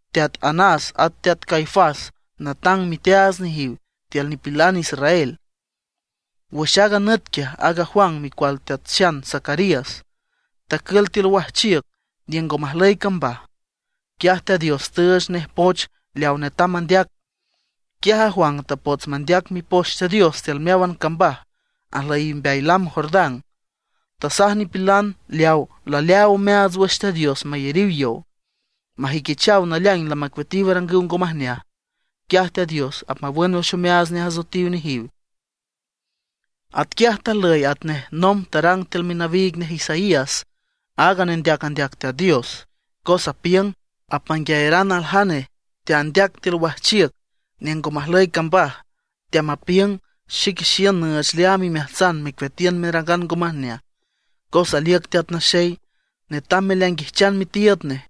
Teat Anás at Teat Caifás natang miteaats nejiw tiül nipilan israel. Wüx aaga nüt quiaj aaga Juan micual teat xan Zacarías, tacül tiül wajchiüc niüng ngo majlüy cambaj. Quiaj Teat Dios tüüch nej poch leawa netam mandeac. Quiaj a Juan tapots mandeac Mipoch Teat Dios tiül meáwan cambaj ajlüyiw mbeay lam Jordán. Tasaj nipilan leaw laleaaw omeaats wüx Teat Dios mayariw yow, majüiquichaw naleaing lamacueatiw arangüw ngo majneaj. Quiaj Teat Dios apmawün wüx omeaats nej asoetiw nejiw. Atquiaj tajlüy atnej nomb tarang tiül minawiig nej Isaías, aaga nendeac andeac Teat Dios, cos tapiüng: Apmanguiayaran aljane teandeac tiül wajchiüc niüng ngo majlüy cambaj, teamapiüng: “Xique xiün nüüch leaam imeajtsan mecueatiün merangan ngo majneaj, cos aliüc Teat Naxey, netam meleainguijchan mitiiüd nej.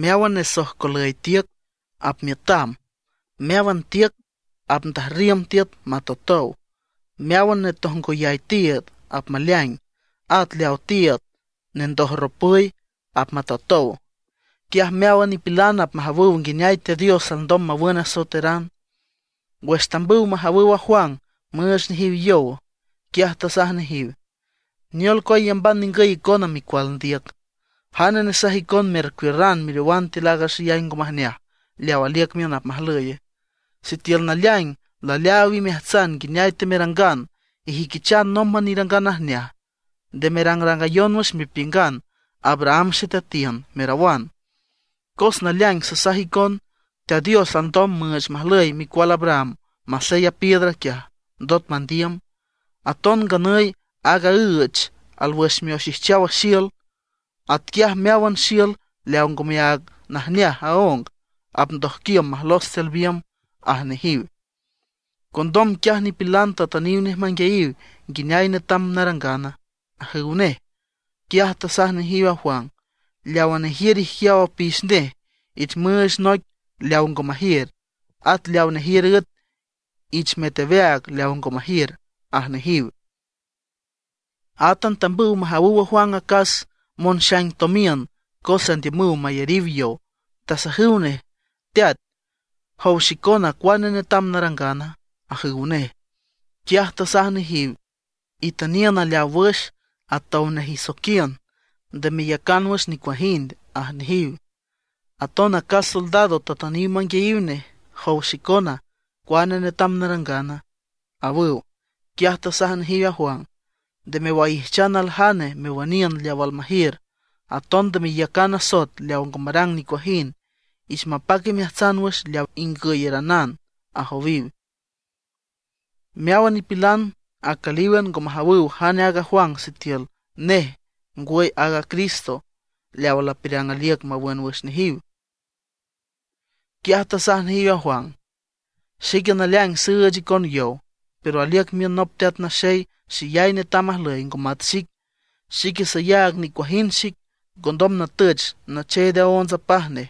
Meáwan nesojcolüy tiüc apmiütam, meáwan tiüc apndajrriüm tiüt matotow; meáwan netojngoyay tiiüd apmaleaing, at leawa tiiüd nendojropüy apmatotow. Quiaj meáwan nipilan apmajawüw nguineay Teat Dios alndom mawün asoeteran.” Wüx tambüw majawüw a Juan müüch nejiw yow, quiaj tasaj nejiw: ―¿Neol cua iyamban ningüy icona micual ndiüc? ¿Jane nesaj icon mercuiürran meriowan tiül aaga xeyay ngo majneaj leaw aliüc miün apmajlüye? Sitiül naleaing laleaaw imeajtsan nguineay temerangan, ijüiquichan nómban irangan najneaj. Nde merangrangayon wüx mepiüngan: “Abraham xeteatiün”, merawan; cos naleaing sasaj icon, Teat Dios alndom müüch majlüy micual Abraham masey a piedra quiaj, ndot mandiüm. Aton nganüy aaga üech alwüx mioxijchaw xiül; atquiaj meáwan xiül leawa ngo mayac najneaj aóng, apndojquiüm majlos tiül biümb ―aj nejiw. Condom quiaj nipilan tatüniw nej manguiayiw: ―¿Nguineay netam narangana? ―ajüw nej. Quiaj tasaj nejiw a Juan: ―Leawa nejiür ijquiaw apix nej ich müüch noic leaw ngo majiür, at leaw nejiür üet, ich müet aweaag leaw ngo majiür ―aj nejiw. Átan tambüw majawüw a Juan acas monxaing tomiün, cos andiümüw mayariw yow. Tasajüw nej: ―Teat, ¿jow xicona, cuane netam narangana? ―ajüw nej. Quiaj tasaj nejiw: ―Itüniün aleaw wüx atow nej isoiquiün, nde meyacan wüx nicuajind ―aj nejiw. Aton acas soldado tatüniw manguiayiw nej: ―Jow xicona, ¿cuane netam narangana? ―awüw. Quiaj tasaj nejiw a Juan: ―Nde mewaijchan aljane mewüniün leaw almajiür, aton nde meyacan asoet leaw ngo marang nicuajind. Ich mapac imeajtsan wüx leaw ingüyaranan ―ajowiw. Meáwan nipilan acülíwan, ngo majawüw jane aaga Juan sitiül nej ngwüy aaga Cristo, leawa lapiürang aliüc mawün nejiw wüx. Quiaj tasaj nejiw a Juan: ―Xique naleaing süüch icon yow, pero aliüc miün nop teat naxey xeyay netam ajlüy ngo mat xic. Xique sayaag nicuajind xic, ngondom natüch nacheed aónts apaj nej.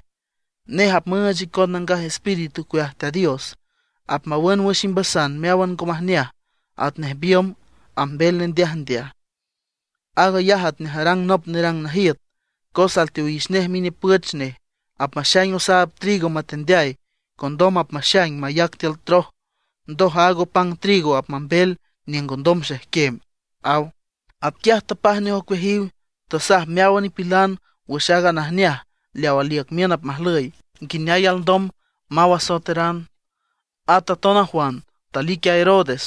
Nej apmüüch icon Nangaj Espíritu ocueaj Teat Dios, apmawün wüx imbasan meáwan ngo majneaj atnej biümb ambel nendeajndeaj. Aag ayaj atnej arang nop nerang najiüt, cos alteowix nej minipüch nej, apmaxaing osaab trigo matendeay, condom apmaxaing mayac tiül troj. Ndoj aaga opang trigo apmambel niüng ngondom xejquem ―aw. Atquiaj tapaj nej ocueajiw, tasaj meáwan nipilan wüx aaga najneaj leaw aliüc miün apmajlüy, nguineay alndom maw asoeteran. At aton a Juan talic a Herodes,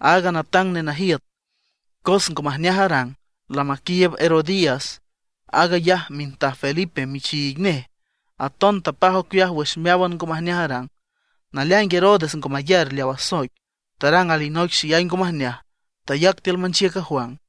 aaga natang nenajiüt, cos ngo majneaj arang, lamaquiiüb Herodías, aag ayaj mintaj Felipe michiig nej. Aton tapaj ocueaj wüx meáwan ngo majneaj arang. Naleaing Herodes ngo mayar leaw asoic, tarang alinoic xeyay ngo majneaj, tayac tiül manchiüc a Juan.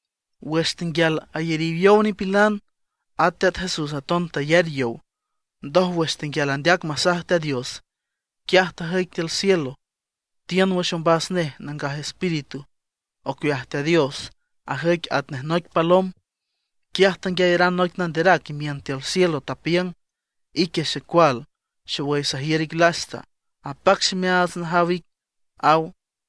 Wüx tenguial ayariw yow nipilan, at Teat Jesús aton tayar yow. Ndoj wüx tenguial andeac masaj Teat Dios, quiaj tajüic tiül cielo, tiün wüx ombas nej Nangaj Espíritu ocueaj Teat Dios, ajüic atnej noic palom. Quiaj tanguiayaran noic nanderac imiün tiül cielo, tapiüng: ―Ique xecual, xowüy sajiür ic lasta, apac ximeaats najaw ic ―aw.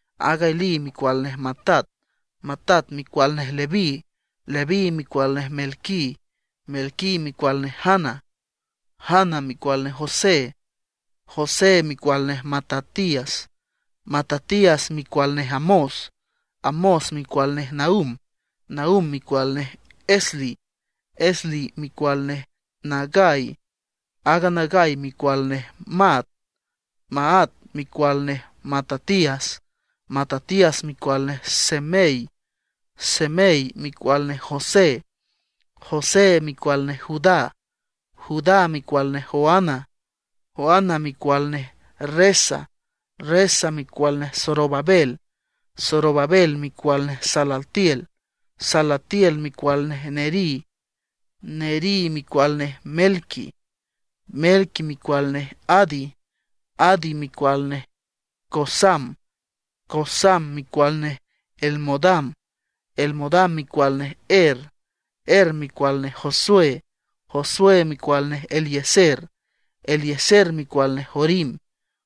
Aaga Elí micual nej Matat, Matat micual nej Leví, Leví micual nej Melqui, Melqui micual nej Jana, Jana micual nej José. José micual nej Matatías, Matatías micual nej Amós. Amós micual nej Nahum. Nahum micual nej Esli, Esli micual nej Nagai. Aaga Nagai micual nej Maat. Maat micual nej Matatías, Matatías micual nej Semei, Semei micual nej José. José micual nej Judá. Judá micual nej Joana, Joana micual nej Resa, Resa micual nej Zorobabel, Zorobabel micual nej Salatiel, Salatiel micual nej Neri. Neri micual nej Melqui, Melqui micual nej Adi, Adi micual nej Cosam, Cosam micual nej Elmodam, Elmodam micual nej Er. Er micual nej Josué, Josué micual nej Eliezer, Eliezer micual nej Jorim,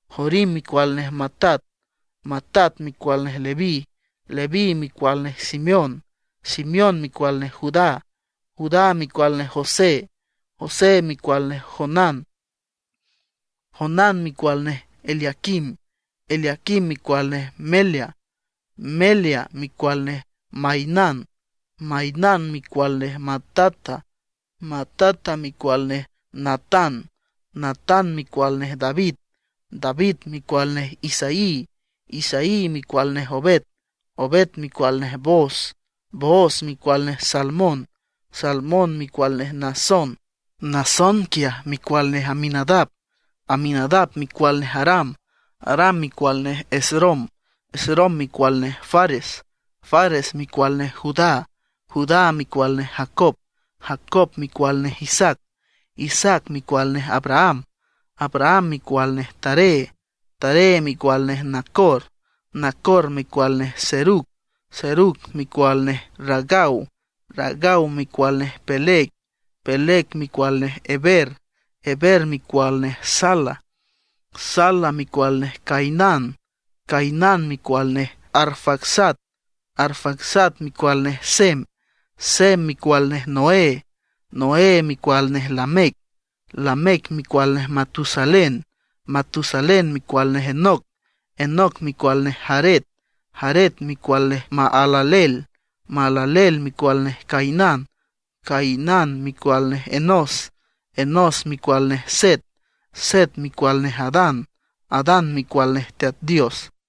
Jorim micual nej Matat. Matat micual nej Leví, Leví micual nej Simeón, Simeón micual nej Judá, Judá micual nej José, José micual nej Jonán, Jonán micual nej Eliaquim. Eliaquim micual nej Melea, Melea micual nej Mainán, Mainán micual nej Matata, Matata micual nej Natán. Natán micual nej David, David micual nej Isaí. Isaí micual nej Obed, Obed micual nej Booz, Booz micual nej Salmón, Salmón micual nej Naasón. Naasón quiaj micual nej Aminadab, Aminadab micual nej Aram, Aram micual nej Esrom, Esrom micual nej Fares, Fares micual nej Judá. Judá micual nej Jacob, Jacob micual nej Isaac, Isaac micual nej Abraham, Abraham micual nej Taré, Taré micual nej Nacor. Nacor micual nej Serug, Serug micual nej Ragau, Ragau micual nej Peleg, Peleg micual nej Heber, Heber micual nej Sala. Sala micual nej Cainán, Cainán micual nej Arfaxad, Arfaxad micual nej Sem, Sem micual nej Noé, Noé micual nej Lamec. Lamec micual nej Matusalén, Matusalén micual nej Enoc, Enoc micual nej Jared, Jared micual nej Mahalaleel, Mahalaleel micual nej Cainán. Cainán micual nej Enós, Enós micual nej Set, Set micual nej Adán, Adán micual nej Teat Dios.